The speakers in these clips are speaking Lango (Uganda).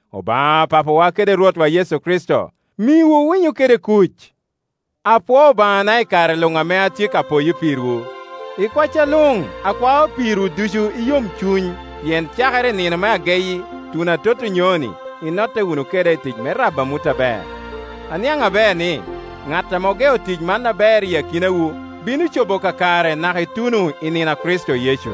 Obaŋa Papawa kede Rwotwa Yecu Kricito miwu winyo kede. Apwoo Obaŋana i kare luŋ ame atye ka poyo pirwu. I kwacca luŋ akwao pirwu ducu i yomcuny, pien cakere i nino me ageyi tuno atot onyoni, inotte wunu keda i tic me rabo amut aber. Aniaŋ aber ni, ŋat ame ogeo tic man aber i akinawu bino cobo kakare naka ituno i nino a Kricito Yecu.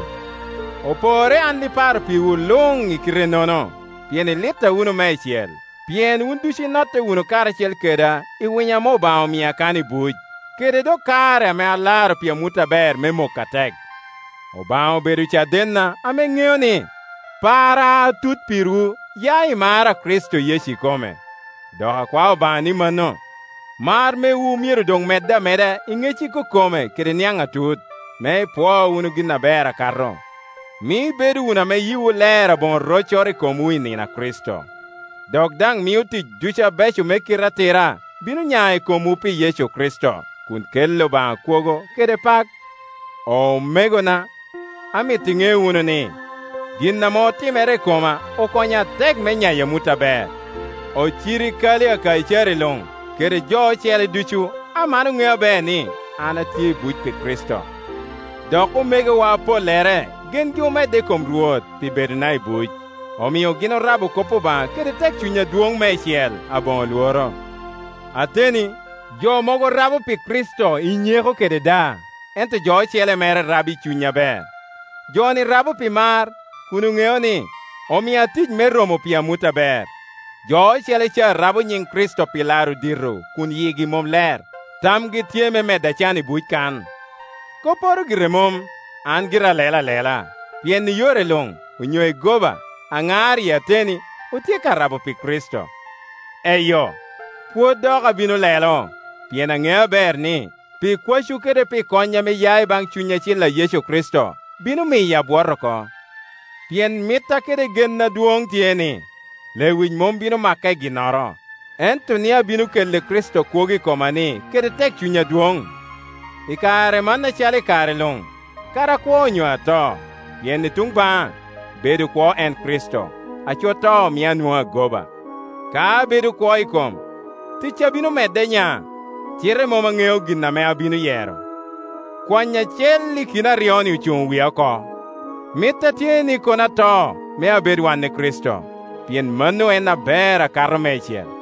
Oporre an iparo pirwu luŋ i kite-nono, pien ilitta wunu meicel, pien wun ducu inotte wunu karacel keda i winyo ame Obaŋa omia kan i buc kede dok kare ame alaro pi amut aber me mok atek. Obaŋa obedo cadenna ame ŋeo ni, parra atut pirwu ya i mar a Kricito Yecu ikome. Dok akwao Obaŋa ni mano, mar mewu myero doŋ medde ameda i ŋec ikokome kede niaŋ atut, me ipwoo wunu gin aber akato. Mio ibedo wunu ame yiwu ler aboŋo roccoro i komwu i nino a Kricito, dok daŋ mio tic ducu abeco me kite atira bino nya i komwu pi Yecu Kricito, kun kelli Obaŋa kwogo kede pak. Omegona, amito iŋe wunu ni, gin ame otimere i koma okonyo atek me nyayo amut aber. Ocirikali a Kaicari luŋ, kede jo ocele ducu, aman oŋeo aber ni, an atye i buc pi Kricito. Dok omegowa apollere gengi omedde i kom Rwot pi bedona i buc, omio gin orabo kop Obaŋa kede tekcuny adwoŋ meicel, aboŋo lworo. Ateni, jo mogo rabo pi Kricito i nyeko kede daa, ento jo ocele mere rabo i cuny aber. Joni rabo pi mar, kun oŋeo ni, omia tic me romo pi amut aber. Jo ocele ca rabo nyiŋ Kricito pi laro dito kun yigi mom ler, tamgi tye me medda can i buc kan. Kopporo gire mom, an gira alelo alela, pien i yore luŋ, onyo i goba aŋar iyi ateni, otye ka rabo pi Kricito. Eyo, pwod dok abino lelo. Pien aŋeo aber ni, pi kwacwu kede pi kony ame ya i baŋ Cuny Acil a Yecu Kricito, bino miyo abwot oko. Pien mitta kede genna adwoŋ tye ni, lewic mom bino maka i ginnoro, ento ni abino kelli Kricito kwogo i koma-ni kede tekcuny adwoŋ, i kare man acalo i kare luŋ, kadi akwo onyo ato. Pien i tuŋ baŋa, bedo kwo en Kricito, aco to mio anwoŋo agoba. Ka abedo kwo i kom, ticca bino medde nya; cite mom aŋeo gin ame abino yero. Kwanyo acel i kin aryo-ni ocuŋo wia oko. Mitta tye ni kono ato me abed wan i Kricito, pien mano en ame ber akato meicel.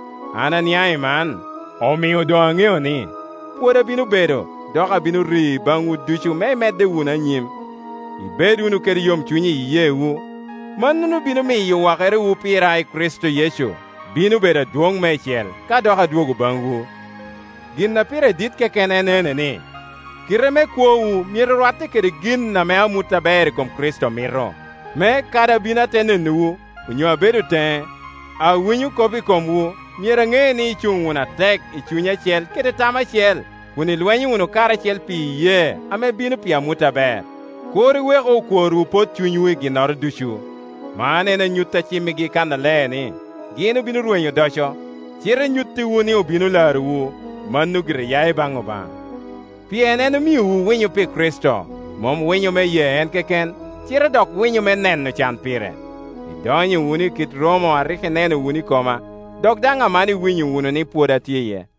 An aniaŋ i man, omio doŋ aŋeo ni, pwod abino bedo, dok abino ri baŋwu ducu me imedde wunu anyim, ibed wunu kede yomcuny i iyeewu. Mano bino miyo wakerewu pira i Kricito Yecu bino bedo adwoŋ meicel, ka dok adwogo baŋwu. Gin a pire dit keken en ene ni, kite me kwowu myero rwatte kede gin ame amut aber i kom Kricito mito, me kadi abino ate nenowu, onyo abedo teŋe, awinyo kop i komwu, myero aŋe ni, icuŋ wunu atek i cuny acel kede tam acel, kun ilwenyo wunu karacel pi iyee ame bino pi amut aber. Kur iweku okworwu pot cunywu i ginnoro ducu. Man en anyut a cimmigi kannaler ni gin obino rwenyo odoco, cite nyuttiwu ni obino larowu; mano gire ya i baŋ Obaŋa. Pien en omiowu winyo pi Kricito, mom winyo me ye en keken, cite dok winyo me neno can pire. Idonyo wunu i kit romo a rik ineno wunu i koma, dok daŋ aman iwinyo wunu ni pwod atye iye.